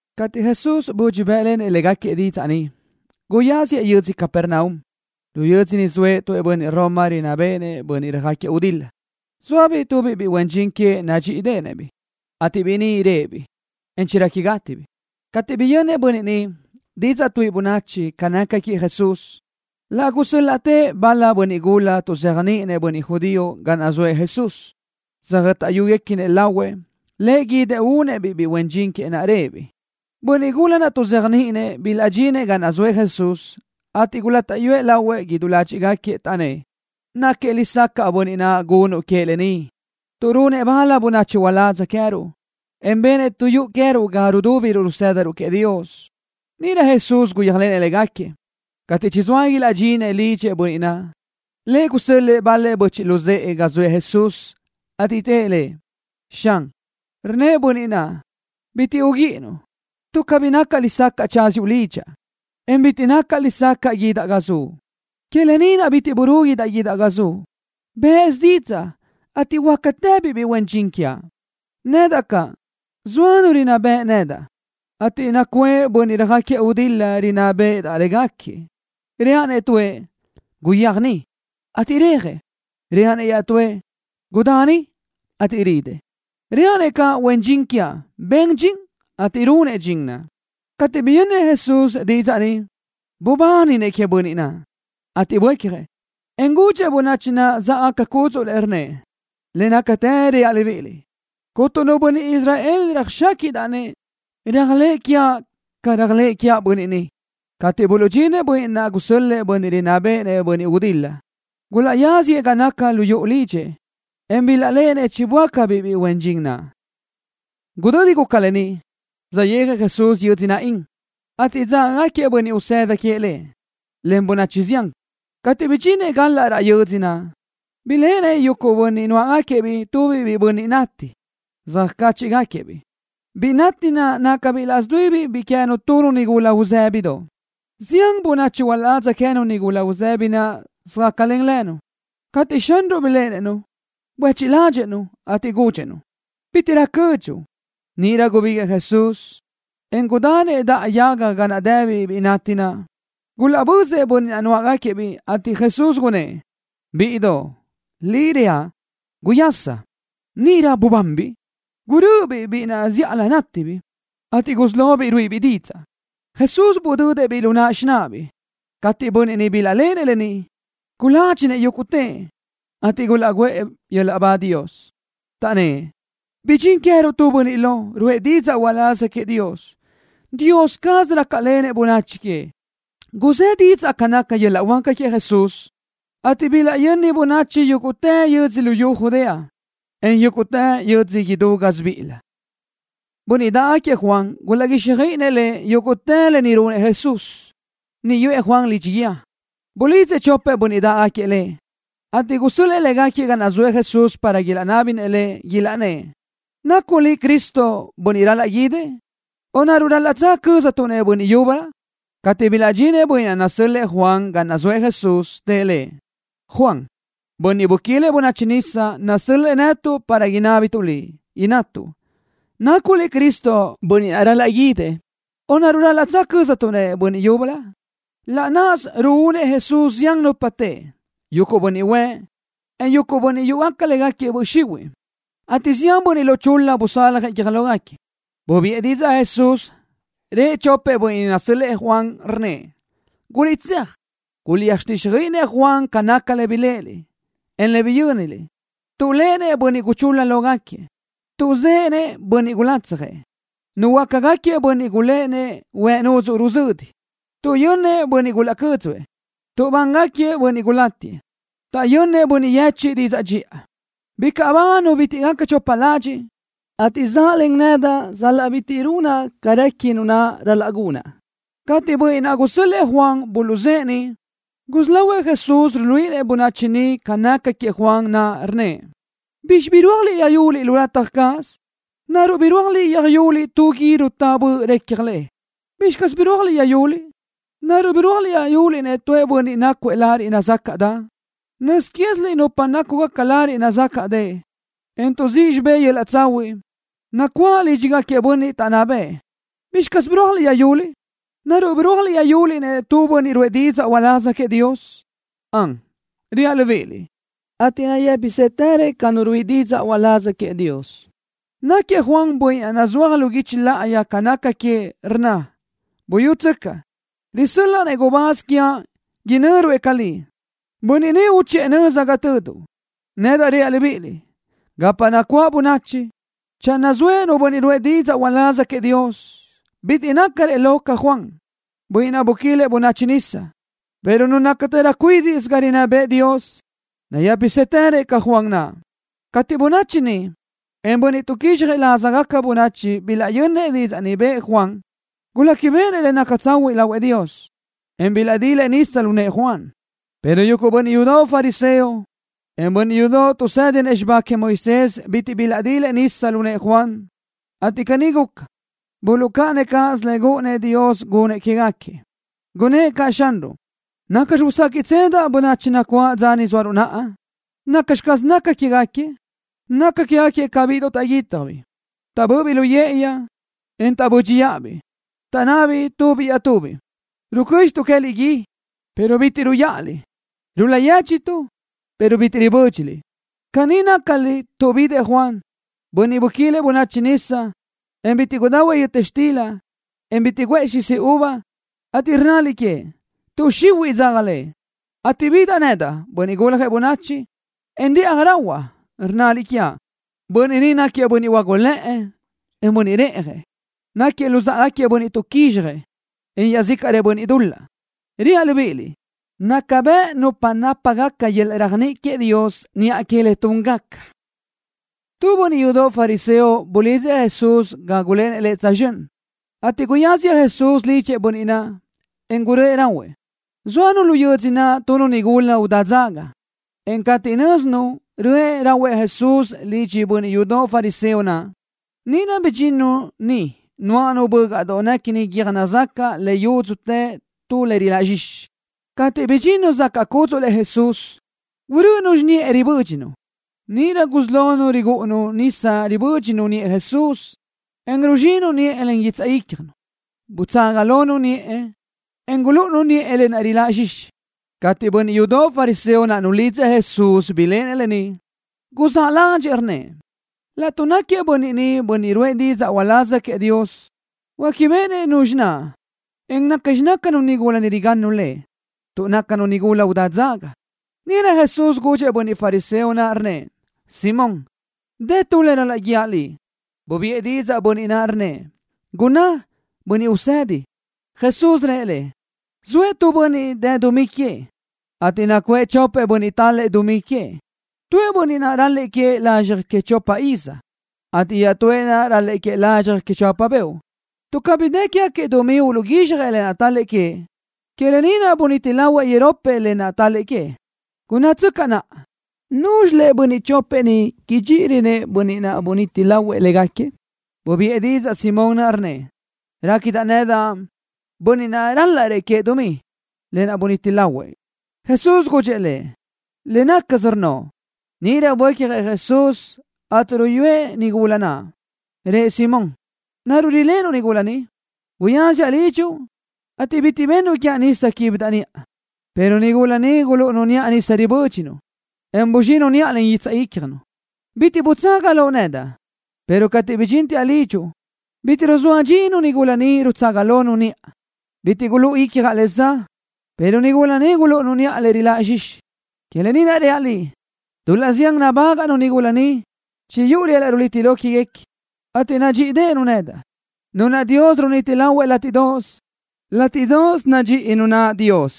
Cateʼ Jesús budxi bë́ʼlenëʼ légaquiëʼ didzaʼ ni, guyáziëʼ yödzö Capernaum. Lu yödzö niʼ zoëʼ tu bönniʼ Roma rinná béʼenëʼ bönniʼ röjáquiëʼ gudil-la. Zóabiʼ biʼi huen dxin queëʼ nadxíʼideʼenëʼ-biʼ, ateʼ biʼi ni réʼebiʼ, en chirequi gátibiʼ. Cateʼ biyönnëʼ bönniʼ ni didzaʼ tuʼë bönachi ca naca queëʼ Jesús, laʼ gusö́l-laʼtëʼ bal-lëʼ bönniʼ gula tuʼzéajniʼinëʼ bönniʼ judío ga naʼ zoëʼ Jesús, tsöjö́taʼyugaquiëʼ lahuëʼ Lëʼ guídëʼ uduhuénëʼ-biʼ biʼi huen dxin queëʼ naʼ réʼebiʼ. Bönniʼ gula tuʼzéajniʼinëʼ naʼ bilaʼdxinëʼ ga zoëʼ Jesús, ateʼ gulátaʼyuëʼ lahuëʼ idú ládxiʼgaquiëʼ, taʼnnë́ʼ: —Náquiëʼ lesacaʼ bönniʼ naʼ gunuʼ queëʼ lë ni, tuʼ runëʼ bal bönachi uládz queë́ruʼ, en benëʼ tu yuʼu queë́ruʼ ga rudúbiruʼ rusë́daruʼ queëʼ Dios. Níʼirö Jesús guyéajlenëʼ légaquiëʼ. Cateʼ chizóa ilaʼdxinëʼ lidxëʼ bönniʼ naʼ, lëʼ gusö́l-lëʼë bal-lëʼ böchiʼ luzë́ʼë ga zëʼë Jesús, ateʼ tëʼ Lëʼ: —Xan, rnnëʼ bönniʼ naʼ: “Bitiʼ uguíʼinuʼ, tuʼ cabí nacaʼ lesacaʼ tsáziuʼ lidxaʼ, en bitiʼ nacaʼ lesacaʼ guídaʼ ga zuʼ. Que lë ni naʼ bitiʼ burúguidaʼ guídaʼ ga zuʼ. Bë́ʼësö didzaʼ, ateʼ huöácatëbiʼ biʼi huen dxin quiaʼ. Nedaʼ caʼ, zoa nu rinná beʼe nedaʼ, ateʼ nacuʼë caʼ bönniʼ röjáquiëʼ gudil-la rinná béʼedaʼ légaquiëʼ. Reaʼ-nëʼ tuëʼ: Guyéaj niʼ, ateʼ rejëʼ. Reaʼ-nëʼ iaʼtúëʼ: Gudá ni, ateʼ ridëʼ. Reaʼ-nëʼ caʼ huen dxin quiaʼ: Ben dxin ni, ateʼ runëʼ dxin naʼ.” Cateʼ biyönnëʼ Jesús didzaʼ ni, bubáninëʼ queëʼ bönniʼ naʼ, ateʼ buécjëʼ, en gudxëʼ bönachi naʼ záʼgaca cúdzuʼlëʼ, rnnëʼ: —Le nácatë reaʼ libíʼiliʼ, cuntu nu bönniʼ Israel bitiʼ röjxáquiʼdaʼ-nëʼ réajlëʼë quiaʼ ca réajlëʼë quiaʼ bönniʼ ni. Cateʼ buluʼdxinëʼ bönniʼ naʼ gusö́l-lëʼë bönniʼ rinná béʼenëʼ bönniʼ röjáquiëʼ gudil-la, gulaʼyáziëʼ ga naca lu yuʼu lidxëʼ, en bilaʼléʼenëʼ chiböácabiʼ biʼi huen dxin naʼ. Gudödi guca lë ni, saʼyéajëʼ Jesús yödzö Naín, ateʼ dzágagaquiëʼ bönniʼ usëda queëʼ Lëʼ, len bönachi zián. Cateʼ bidxinëʼ galaʼ raʼ yödzö naʼ, biléʼenëʼ yuguʼ bönniʼ nuáʼagaquiëʼ-biʼ tubiʼ biʼi bönniʼ nati. Söjcáchiʼgaquiëʼ-biʼ. Biʼi nati naʼ nácabiʼ laʼs dui biʼi queë́nu tu nigula uzë́bidoʼ. Zián bönachi uladza queë́nu nigula uzëbi naʼ söjácalen-nu. Cateʼ Xanruʼ biléʼenëʼ-nu, buéchiʼ ládxëʼë-nu, ateʼ gudxëʼ-nu: —Bítiʼrö cödxuʼ. Níʼirö gubíguiʼë Jesús, en gudanëʼ daʼa yaga ga naʼ dëbiʼ biʼi nati naʼ. Gulaʼbözëʼ bönniʼ naʼ nuáʼagaquiëʼ-biʼ, ateʼ Jesús gunnë́ʼ: —Biʼidoʼ, liʼ reaʼ, guyasa. Níʼirö bubanbiʼ. Gurö́ʼöbiʼ biʼi naʼ zíʼalö nátibiʼ, ateʼ gusí lobiʼ ruíʼibiʼ didzaʼ. Jesús budödëʼ-biʼ lu náʼanu xináʼabiʼ. Cateʼ bönniʼ niʼ bilaʼléʼenëʼ lë ni, guládxinëʼ yúguʼtëʼ, ateʼ gulaʼguʼë Dios yöl-laʼ ba, taʼnnë́ʼ: —Bidxín queë́ruʼ tu bönniʼ lo, ruʼë didzaʼ uláz queëʼ Dios. Dios caz rácalenëʼ bönachi queëʼ. Guzë́ didzaʼ ca naca yöl-laʼ huáca queëʼ Jesús, ateʼ bilaʼyöni bönachi yúguʼtë yödzö luyú Judea, en yúguʼtë yödzö idú gásibiʼilö. Bönniʼ dáʼgaquiëʼ Juan gulaʼguíxjöiʼinëʼ lëʼ yúguʼtë lë ni runëʼ Jesús. Niʼ yuʼë Juan lidxi guíë, bulidzëʼ chopëʼ bönniʼ naʼ dáʼgaquiëʼ lë, ateʼ gusö́l-lëʼë légaquiëʼ ga naʼ zoëʼ Jesús para ilaʼnábinëʼ Lëʼ, ilaʼnnë́ʼ: “¿Nacuʼ Liʼ Cristo, bönniʼ ral-laʼ guídëʼ, o naruʼ ral-laʼ cöztuʼ-nëʼ bönniʼ yúbölö?” Cateʼ bilaʼdxinëʼ bönniʼ naʼ nasö́l-lëʼë Juan ga naʼ zoëʼ Jesús, tëʼ Lëʼ: —Juan, bönniʼ buquilëʼ bönachi nisa, nasö́l-lëʼë netuʼ para inábituʼ Liʼ, innatuʼ: “¿Nacuʼ Liʼ Cristo, bönniʼ naʼ ral-laʼ guídëʼ, o naruʼ ral-laʼ cöztuʼ-nëʼ bönniʼ yúbölö?” Laʼ náʼasö ruúnëʼ Jesús zián nupa teʼe, yuguʼ bönniʼ huëʼ, en bönniʼ yúʼugaca légaquiëʼ böʼ xihuiʼ, ateʼ zián bönniʼ lo chul-la busaljëʼ guiö́j lógaquiëʼ. Bubiʼë didzaʼ Jesús, rëʼ chopëʼ bönniʼ naʼ nasö́l-lëʼë Juan, rnnëʼ: —Guliʼtséaj, guliʼtsöjtíxjöiʼi-nëʼ Juan ca naca le biléʼeliʼ, en le biyö́niliʼ. Tuʼléʼenëʼ bönniʼ guchul-la lógaquiëʼ. Tuʼzë́ʼë bönniʼ gulatsjëʼ. Nuhuöácagaquiëʼ bönniʼ güíʼiguequinëʼ huëʼ nudzuʼ ruzödi. Tuʼyö́nnëʼ bönniʼ gulaʼcö́dzuëʼ. Nubángaquiëʼ bönniʼ gulátiëʼ. Taʼyönnëʼ bönniʼ yechiʼ didzaʼ dxiʼa. Bicaʼ ba nu bitiʼ gaca chopa ladxiʼ, ateʼ zaʼlen nedaʼ sal-laʼ bitiʼ runaʼ ca réqui nu naʼ ral-laʼ gunaʼ. Cateʼ bönniʼ naʼ gusö́l-lëʼë Juan buluʼzë́ʼë niʼ, gusí lahuëʼ Jesús ruluíʼinëʼ bönachi niʼ ca naca queëʼ Juan naʼ, rnnëʼ: —¿Bizxi birúajliʼ yöjyuliʼ lu lataj cáʼasö? ¿Naruʼ birúajliʼ yöjyuliʼ tu gui rutá böʼ recja le? ¿Bizxi caz birúajliʼ yöjyuliʼ? ¿Naruʼ birúajliʼ yöjyuliʼ-nëʼ tu bönniʼ nácuëʼ lariʼ nazácaʼdeʼe? Nöz quéziliʼ nupa nácugaca lariʼ nazácaʼdeʼe, en tuʼzíʼ xibé yöl-laʼ tsahuiʼ, nacuáʼ lídxigaquiëʼ bönniʼ taʼnná bëʼë. ¿Bizxi caz birúajliʼ yöjyuliʼ? ¿Naruʼ birúajliʼ yöjyuliʼ-nëʼ tu bönniʼ ruʼë didzaʼ uláz queëʼ Dios? Ön, reaʼ libíʼiliʼ, ateʼ nayë́pisëtërëʼ ca nu ruíʼi didzaʼ uláz queëʼ Dios. Náquiëʼ Juan bönniʼ naʼ nazúaj lu guichi láʼayi ca naca queëʼ, rnna: Buyútsöcaʼ, risö́l-laʼa-nëʼ gubáz quiaʼ, inö́ruëʼ ca Liʼ. Bönniʼ ni uchiʼë nöza ga töduʼ. ’Nedaʼ reaʼ libíʼiliʼ: Gapa nacuáʼ bönachi, channö zoëʼ nu bönniʼ ruʼë didzaʼ uláz queëʼ Dios, bitiʼ nácarëʼ lo ca Juan, bönniʼ naʼ buquilëʼ bönachi nisa, pero nu nácatërö cuídiʼsö ga rinná bëʼë Dios nayë́pisëtërö ca Juan naʼ. Cateʼ bönachi niʼ, en bönniʼ tuʼquizxjëʼ lázagaca bönachi bilaʼyönnëʼ didzaʼ ni bëʼë Juan, guléquibeʼenëʼ le naca tsahuiʼ lahuëʼ Dios, en bilaʼdilëʼ nisa lu nëʼë Juan, pero yuguʼ bönniʼ yudoʼ fariseo, en bönniʼ yudoʼ tuʼsédinëʼ xibá queëʼ Moisés bitiʼ bilaʼdilëʼ nisa lu nëʼë Juan, ateʼ caní guca, buluʼcáʼanëʼ cáʼasö le gúʼunnëʼ Dios gunëʼ quégaquiëʼ. Gunnë́ʼ caʼ Xanruʼ: —¿Nacxi uséquiʼtsedaʼ bönachi nacuáʼ dza ni zóaruʼ naʼa? ¿Nacxi caz nácagaquiëʼ? Nácagaquiëʼ ca bíʼidoʼ taʼguítjabiʼ. Taʼbö́ʼöbiʼ lu yë́ʼëyi, en taʼbö́dxiʼabiʼ. Taʼnnabiʼ tubiʼ iaʼtubiʼ: “Rucö́dxituʼ queë́liʼ gui, pero bitiʼ ruyáʼaliʼ. Rul-la yéchiʼtuʼ, pero bitiʼ ribö́dxiliʼ.” Caní nácaliʼ tuʼ bidëʼ Juan, bönniʼ buquilëʼ bönachi nisa, en bitiʼ gudahuëʼ yöta xtila, en bitiʼ guʼë xisi uva, ateʼ rnnaliʼ queëʼ: “Tuʼ xihuiʼ dzaga lëʼ.” Cateʼ bidaʼ nedaʼ, Bönniʼ Guljëʼ Bönachi, en rëʼaj rahuaʼ, rnnaliʼ quiaʼ: “Bönniʼ ni náquiëʼ bönniʼ huágulëʼë, en bönniʼ reʼjëʼ. Náquiëʼ luzáʼagaquiëʼ bönniʼ tuʼquizxjëʼ, en iaʼzícaʼrëʼ bönniʼ dul-laʼ.” Reaʼ libíʼiliʼ: Naca bëʼ nupa nápagaca yöl-laʼ réajniʼi queëʼ Dios niʼa que le túngaca. Tu bönniʼ yudoʼ fariseo bulidzëʼ Jesús gágulenëʼ lëʼ tsözxö́n, ateʼ guyáziëʼ Jesús lidxëʼ bönniʼ naʼ, en guröʼë rahuëʼ. Zóanu lu yödzö naʼ tu nigula udá dzaga, en cateʼ nö́zinu röʼë rahuëʼ Jesús lidxëʼ bönniʼ yudoʼ fariseo naʼ, níʼirö bidxinnu niʼ nuáʼanu tu bö́gaʼdoʼ néquini guiö́j nazacaʼ le yudzu tu le riláʼ zxixi. Cateʼ bidxinnu zacaʼ cúdzuʼlëʼ Jesús, gurö́ʼönu xiniʼë ribö́dxinu. Níʼirö gusí lonu rigúʼunu nisa ribö́dxinu niʼë Jesús, en ruzxinu niʼë len guitsaʼ ícjanu. Butsaga lonu niʼë, en gulúʼunu niʼë lë naʼ riláʼ zxixi. Cateʼ bönniʼ yudoʼ fariseo naʼ nulidzëʼ Jesús biléʼenëʼ lë ni, guzáʼ ládxëʼë, rnnëʼ: “Laʼtuʼ náquiëʼ bönniʼ ni bönniʼ ruʼë didzaʼ uláz queëʼ Dios, huéquibeʼenëʼ nuzxi naʼ, en nacxi nácanu nigula ni rigannu Lëʼ, tuʼ nácanu nigula udá dzaga.” Níʼirö Jesús gudxëʼ bönniʼ fariseo naʼ, rnnëʼ: —Simón, dë tu le ral-laʼ guíaʼ liʼ. Bubiʼë didzaʼ bönniʼ naʼ, rnnëʼ: —Gunná, Bönniʼ Usedi. Jesús rëʼ lëʼ: —Zoëʼ tu bönniʼ dë dumí queëʼ, ateʼ nacuʼë chopëʼ bönniʼ tál-lëʼë dumí queëʼ. Tuëʼ bönniʼ naʼ ral-lëʼë queëʼ lazxjëʼ que chopa iz, ateʼ iaʼtúëʼ naʼ ral-lëʼë queëʼ lazxjëʼ que chopa beoʼ. Tuʼ cabí dë quégaquiëʼ dumí uluʼguízxjëʼ lë naʼ tál-lëʼë queëʼ, que lë ni naʼ buniti lahuëʼ iropëʼ lë naʼ tál-lëʼë queëʼ. Gunnátsöcaʼ naʼa. ¿Núzxilëʼ bönniʼ chopëʼ ni idxíʼirönëʼ bönniʼ naʼ buniti lahuëʼ légaquiëʼ? Bubiʼë didzaʼ Simón naʼ, rnnëʼ: —Réquidaʼ nedaʼ, bönniʼ naʼ rálaʼrëʼ queëʼ dumí, lë naʼ buniti lahuëʼ. Jesús gudxëʼ lëʼ: —Le nácasö rnnoʼ. Níʼirö buécjëʼ Jesús, ateʼ niʼ ruyúëʼ-nu nigula naʼ, rëʼ Simón: —¿Naruʼ riléʼenuʼ nigula ni? Guyáziaʼ lidxuʼ, ateʼ bitiʼ bennuʼ quiaʼ nisa quíbidaʼ niʼa, pero nigula ni gulúʼunu niʼa nisa ribö́dxinu, en buzxinu niʼa len guitsaʼ ícjanu. Bitiʼ butsaga loʼ nedaʼ, pero cateʼ bidxínteaʼ lidxuʼ, bitiʼ ruzóa dxinu nigula ni, rutsaga lonu niʼa. Bitiʼ gulúʼu icjaʼ le za, pero nigula ni gulúʼunu niʼa lë naʼ riláʼ zxixi. Que lë ni naʼ reaʼ liʼ, dul-laʼ zián gubágaʼnu nigula ni, chiguyúʼu yöl-laʼ runiti lo quéguequi, ateʼ nadxíʼideʼenu nedaʼ. Nu naʼ Dios runiti lahuëʼ le látiʼdoʼos, látiʼdoʼos nadxíʼi Dios nu naʼ.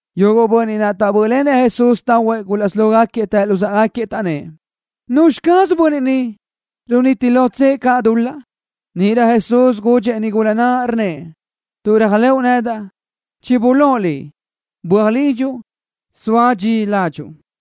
Yuguʼ bönniʼ naʼ taʼbö́ʼlenëʼ Jesús tahuëʼ gulaʼsí lógaquiëʼ tëʼ luzáʼagaquiëʼ, taʼnnë́ʼ: —¿Nuzxi caz bönniʼ ni, runiti lotsëʼ caʼ dul-laʼ? Níʼirö Jesús gudxëʼ-nu nigula naʼ, rnnëʼ: —Tuʼ réajlëʼu nedaʼ, chibulóʼ liʼ. Böaj lidxuʼ, zoa dxi ládxuʼu.